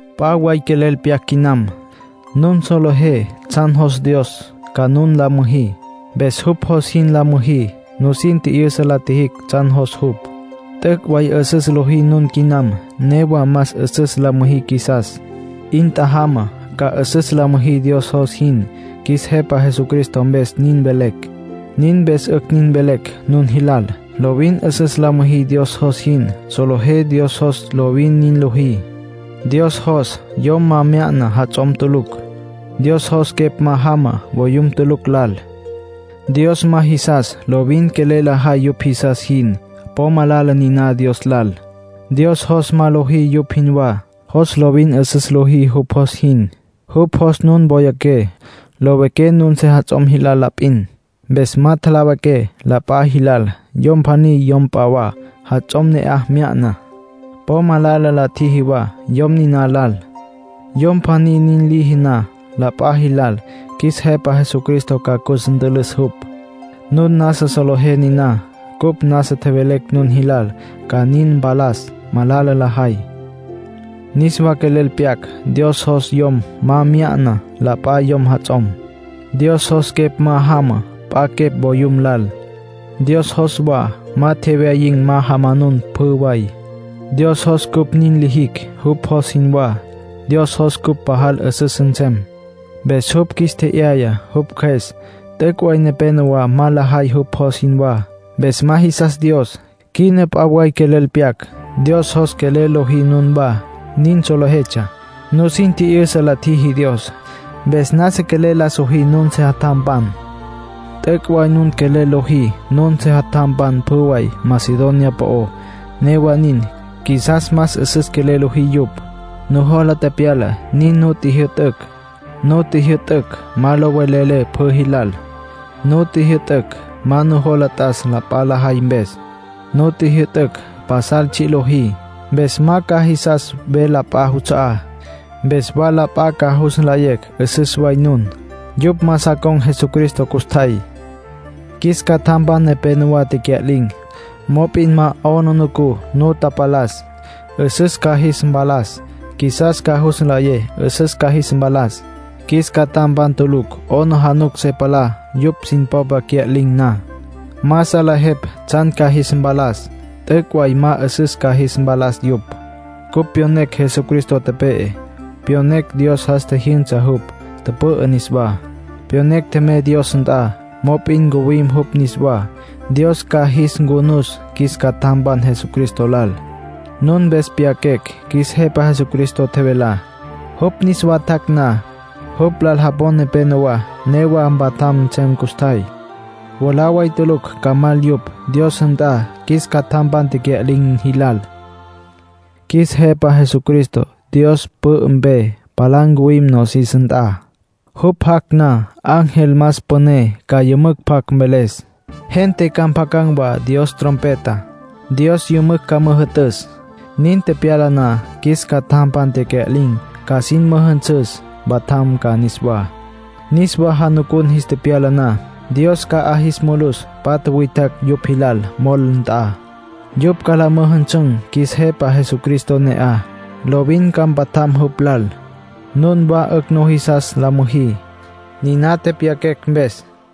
P'a way quelel pyac quinam. Nun solejé tsjan jos Dios ca nun la müjí. Mpes jupj jos jin la müjí. Nusin tji'yüsa la tjijicj tsjan jos jupj. T'üc' way 'üsüs lojí nun quinam. Newa más 'üsüs la müjí qjuisas. 'In tjajama ca 'üsüs la müjí Dios jos jin. Qjuis Jepa Jesucristo mpes nin velecj; nin mpes 'ücj nin velecj nun jilal. Lovin 'üsüs la müjí Dios jos jin. Solejé Dios jos lovin nin lojí. Dios jos yom ma mya'na jats'om tulucj. Dios jos quepj ma jama voyum tulucj lal. Dios ma jisas lovin quelel lajay yupj jisas jin. Po malala niná Dios lal. Dios jos ma lojí yupj jinwá, jos lovin 'üsüs lojí jupj jos jin. Jupj jos nun woyaqué, lowiqué nun sejats'om jilal la p'in. Mpes ma tjalawiqué la p'a jilal. Yom pjaní yom p'a wa jats'om ne'aj mya'na, po malala la tjiji wa yom niná lal. Yom pjaní nin liji na la p'a jilal, qjuis Jepa Jesucristo ca cus ntülüs jupj. Nun nasa solejé niná. Cupj nasa tjevelecj nun jilal ca nin mpalas malala lajay. Niswa quelel pyaquecj Dios jos yom ma mya'na la p'a yom jats'om. Dios jos quepj ma jama p'a quepj voyum lal. Dios jos wa ma tjewyayin̈ ma jamanun pjü way. Dios jos cupj nin lijicj jupj jos jinwá. Dios jos cupj pajal 'üsüs nsem. Mpes jupj qjuis tje'yaya jupj Cjües. T'üc' way nepénowa ma lajay jupj jos jinwá. Mpes ma jisas Dios. Quina p'a way quelel pyaquecj. Dios jos quelel lojí nunwá. Nin solejetsja. Nusin tji'yüsa la tjiji Dios. Mpes nasa quelel la sojí nun sejatjampan. T'üc' way nun quelel lojí nun sejatjampan pjü way Macedonia po'ó. Newa nin, qjuisas más 'üsüs quelel lojí yupj. Nujola tepyala nin nu tjijyü'tücj. Nu tjijyü'tücj ma lo velelé pjü jilal. Nu tjijyü'tücj ma nujola t'as la p'a lajay mpes. Nu tjijyü'tücj pasal tsji' lojí. Mpes ca ma jisas ves, la p'a juts'a'á. Mpes wa la p'a ca jus nlayecj 'üsüs way nun. Yupj ma sa con̈ Jesucristo custjay. Qjuis catjampan nepénowa tecya'lin̈. Mop'in ma 'aplijila nu tapalas. 'Üsüs ca jis mpalas. Qjuisas ca jus nlayé 'üsüs ca jis mpalas. Qjuis catjampan tulucj 'aplijila se palá yupj sin popa cya'lin̈ na. Ma salejepj tsjan ca jis mpalas. T'üc' way ma 'üsüs ca jis mpalas yupj. Cupj pyonecj Jesucristo tepe'e. Pyonecj Dios jas tjijyünsa jupj, tüpü'ü niswá. Pyonecj tjemey Dios nt'a, mop'in ncuwim jupj niswá. Dios ca jis ncunus qjuis catjampan Jesucristo lal. Nun mpes pyaquecj qjuis Jepa Jesucristo tjevelá. Jupj niswa tjac' na, jupj lal japon nepénowa newa mpatjam nsem custjay. Mwalá way tulucj ca mal yupj Dios nt'a qjuis catjampan tecya'lin̈ jilal. Qjuis Jepa Jesucristo Dios pü'ü mpe palá ncuwim nosis nt'a. Jupj jac' na, ángel más püné ca yümücj pjac mveles. Gente ca mpjacan̈ wa Dios trompeta. Dios yümücj ca müjü'tüs. Nin tepyala na, qjuis catjampan tecya'lin̈ ca sin müjünsüs, mpatjam ca niswá. Niswa janucun jis tepyala na, Dios ca 'a jis mulus patja witjacj yupj jilal mol nt'a. Yupj ca la müjüsün̈ qjuis Jepa Jesucristo ne'aj. Lovin ca mpatjam jupj lal. Nunwá 'ücj nujisas la müjí, niná tepyaquecj mpes.